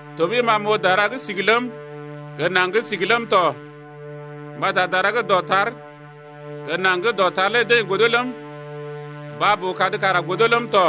Tɔɓəi ma m’oo dara gə́ sigi ləm, gə naŋg gə́ sigi ləm tɔ, mbata dara gə́ dɔtar gə naŋg gə́ dɔtar lé deḛ godo ləm, baa-boo-kad kara godo ləm tɔ,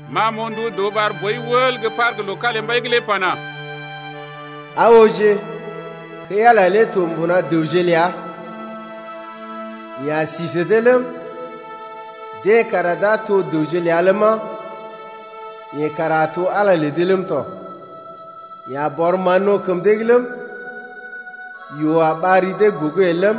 Ma m’oo ndu dəw ɓar boi wəl gə́ par gə́ loo kalimbai’g lé pana: Aa ooje, kəi-Ala lé to mbuna dəwje ləa. Yeḛ a sí sə dee ləm, deḛ kara d’a to dəwje ləa ləma, yeḛ kara a to Ala lə dee ləm tɔ. Yeḛ a bɔr mán-no̰ kəm dee’g ləm, yoo a ɓar ri dee gogo el ləm,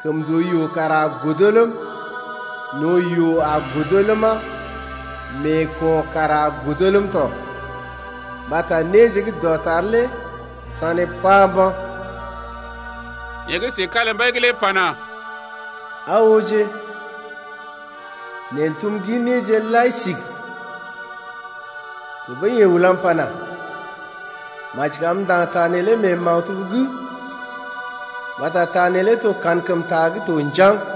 kəmndooyoo kara a godo ləm, no̰ yoo a godo ləma, meeko̰ kara a godo ləm tɔ mbata néje gə́ dɔtar lé sané pá mba̰. Yeḛ gə́ si kalimbai’g lé pana: Aa ooje, neḛ n’tum gin néje lai sigi. Tɔɓəi yeḛ ulam pana: Maji kam m’ndaŋg ta neelé mee maktub’g mbata ta neelé to kankəmta gə́ to njaŋg.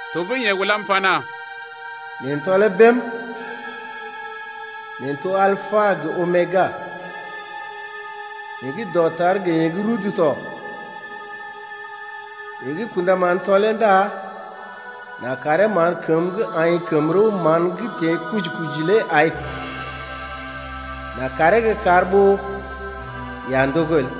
Tɔɓəi yeḛ ulam pana: Neḛ n’tɔlee bém. Neḛ n’to Alpa gə Omega, yeḛ gə́ dɔtar gə yeḛ gə́ rudu tɔ. Yeḛ gə́ kṵdaman tɔlee ndá n’a karee mán kəmə gə́ aḭ kəm-rəw-mán gə́ teḛ kuji-kuji lé ai, n’a karee gə́ kar ɓó yeḛ a ndogo el.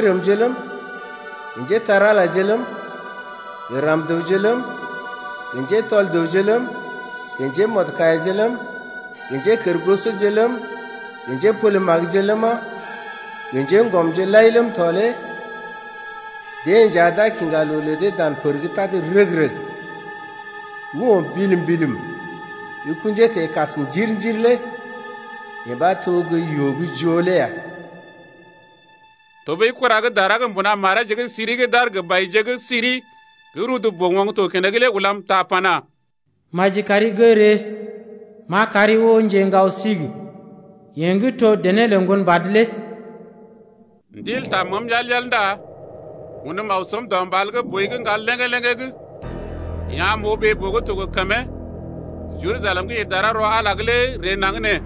Nɛ njérəmje ləm, gə njépole-magəje ləm, gə ram-dəwje ləm, gə njetɔl dəwje ləm, gə njémɔdkaiyaje ləm, gə njékərgosoje ləm, gə njépole-magəje ləma, gə njéŋgɔmje lai ləm tɔ lé deḛ nja d’a kiŋga loo lə dee dan pər gə́ tad rəg-rəg gə́ o̰ bilim-bilim gə́ kṵjee teḛ kas njir-njir lé yee ɓa to gə́ yoo gə́ joo lé ya. Tɔɓəi kura gə́ dara gə́ mbuna mareeje gə́ siri gə́ d’aar gə baije gə́ siri gə́ rudu boo-oŋg to keneŋ lé ulam ta pana: Maji kari gə́ ree, m’a kari oo njeŋgao-sigi, yeḛ gə́ to dené lə Ŋgonbad lé. Ndil taa məəm yal-yal ndá unm aw səm dɔ mbal gə́ boi gə́ ŋgal léŋgé-léŋgé’g. Yeḛ am m’oo ɓee-boo gə́ to gə kəmee, Jerusalem gə́ ḭ dara rɔ Ala’g lé ree naŋg nee.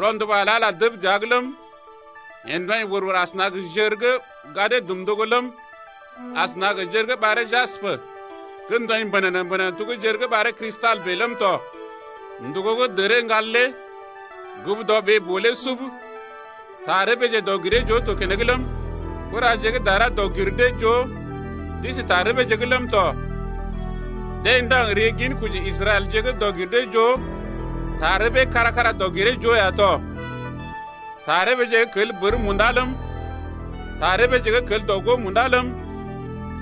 Rɔnduba lə Ala dəb dəa’g ləm, yee ndɔḭ wər-wər asəna gə jər gə́ gadee dum ndogo ləm, asəna gə jər gə́ ɓaree jaspə gə́ ndɔḭ mbənənə-mbənənə to gə́ jər gə́ ɓaree Kristal bèe ləm tɔ. Ndògo gə́ dəree ŋgal lé gugu dɔ ɓee-boo lé sub. Tarəbeeje dɔg-giree-joo to keneŋ ləm, kuraje gə́ dara dɔg-gir-dee-joo d’isi tarəbeeje’g ləm tɔ. Deḛ ndaŋg ri ginkoji Israɛlje dɔg-gir-dee-joo tarəbee kára-kára dɔg-giree-joo ya tɔ. Tarəbeeje gə́ kel bər munda ləm, tarəbeeje gə́ kel dɔ-gó munda ləm,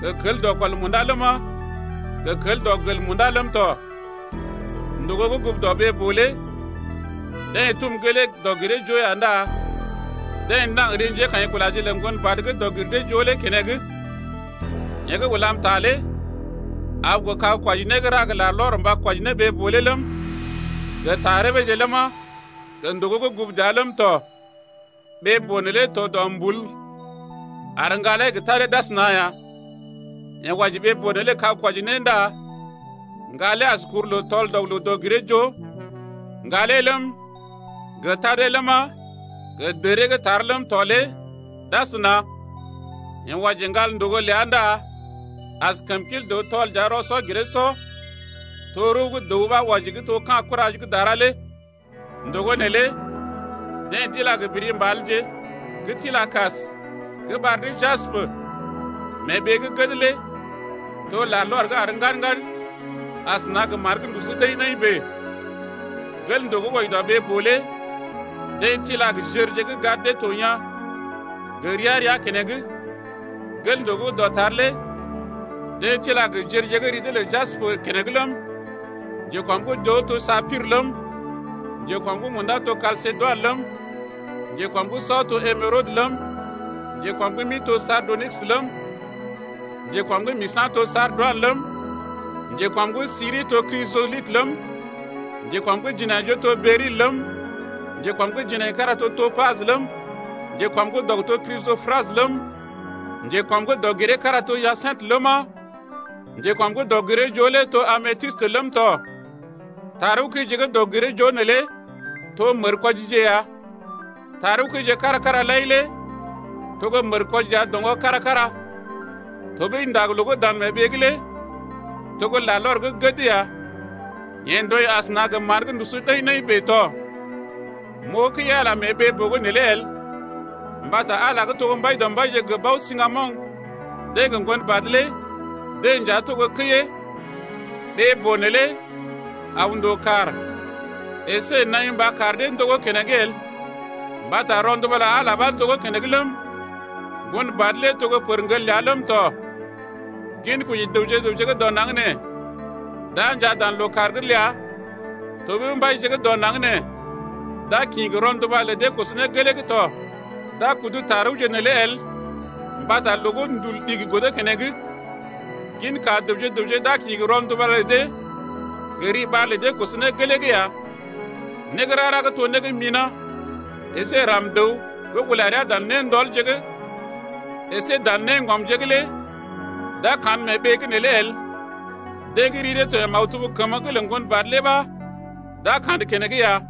gə kel dɔkɔl munda ləma, gə gə́ kel dɔgel munda ləm tɔ. Ndògo gə́ gugu dɔ ɓee-boo lé deḛ tum gelee dɔg-giree-joo ya ndá deḛ ndaŋg ri njékaḭkulaje lə Ŋgonbad gə́ dɔg-gir-dee-joo lé keneŋ. Yeḛ gə́ ulam ta lé aw gə kag-kwɔji-né gə́ ra gə larlɔr mba kwɔji ne ɓee-boo lé ləm, gə tarəbeeje ləma, gə ndògo gə́ gugu dəa lé ləm tɔ. Ɓee-boo neelé to dɔmbul ar ŋgalee gə tadee d’asəna ya. Yeḛ wɔji ɓee-boo neelé gə kag-kwɔji-né ndá ŋgalee as kuruloo tɔl-dɔg-loo dɔg-giree-joo. Ŋgalee ləm, gə tadee ləma, gə dəree gə́ tar ləm tɔ lé d’asəna. Yeḛ wɔji ŋgal ndògo ləa ndá as kəmkil dəw tɔl-dəa-rɔ-sɔ-giree-sɔ, to rəw gə́ dəw ɓa wɔji gə́ to ka̰ kura gə́ dara lé. Ndògo neelé deḛ d’ila gə biri mbalje gə́ tila kas gə́ ɓar dee jaspə. Mee ɓee gə́ gəd lé to larlɔr gə́ àr ŋgad-ŋgad asəna gə mán gə́ ndusu ɗəḭ-ɗəḭ bèe. Gel ndògo gə́ wɔji dɔ ɓee-boo lé deḛ tila jərje gə́ gad dee to yaa̰ gə́ gə ria-ria keneŋ: gel ndògo gə́ dɔtar lé deḛ tila jərje gə́ ri dee lə jaspə keneŋ ləm, njekɔm’g joo to sapir ləm, njekɔm’g munda to Kalsedoin ləm, njekɔm’g sɔ to emerodə ləm, njekɔm’g mi to sardonikis ləm, njekɔm’g misa̰ to sardoinə ləm, njekɔm’g siri to Krijɔlitə ləm, njekɔm’g jinaijoo to beryl ləm, njekɔm’g jinaikara to topajə ləm, njekɔm’g dɔg to Krisɔprasə ləm, njekɔm’g dɔg-giree-kára to hyasintə ləma, njekɔm’g dɔg-giree-joo lé to ametistə ləm tɔ. Tarəwkəije gə́ dɔg-giree-joo neelé to mərkwɔjije ya. Tarəwkəije kára-kára lai lé to gə́ mərkwɔji ya doŋgɔ kára-kára. Tɔɓəi ndag-loo gə́ dan mee ɓee’g lé to gə́ larlɔr gə́ gəd ya, yee ndɔḭ asəna gə mán gə́ ndusu ɗəḭ-ɗəḭ bèe tɔ. M’oo kəi-Ala mee ɓee-boo’g neelé el, mbata Ala gə́ to Mbaidɔmbaije gə́ Bao-siŋgamoŋ deḛ gə Ŋgonbad lé deḛ nja to gə́ kəiyee. Ɓee-boo neelé aw ndòo kàr əsé naḭ mba kar dee ndogó keneŋ el, mbata rɔnduba lə Ala ɓa ndogó keneŋ ləm, Ŋgonbad lé to gə́ pərŋgel ləa ləm tɔ. Ginkoji dəwje gə raŋg dɔ naŋg nee d’a njaa dan lookàr’g ləa tɔɓəi mbaije gə́ dɔ naŋg nee d’a kḭ gə rɔnduba lə dee koso ne gelee’g tɔ. D’a kudu tarəwje neelé el mbata loo gə́ ndul ɗigi godo keneŋ. Ginka dəwje-dəwje d’a kḭ gə rɔnduba lə dee gə riɓar lə dee koso ne gelee’g ya. Né gə́ rara gə́ to né gə́ mina̰ əsé ram-dəw gə́ ula rəa dan néndɔlje’g əsé dan néŋgɔmje’g lé d’a kandə mee ɓee’g neelé el. Deḛ gə́ ri dee to mee maktub kəmə’g lə Ŋgonbad lé ɓa d’a kandə keneŋ ya.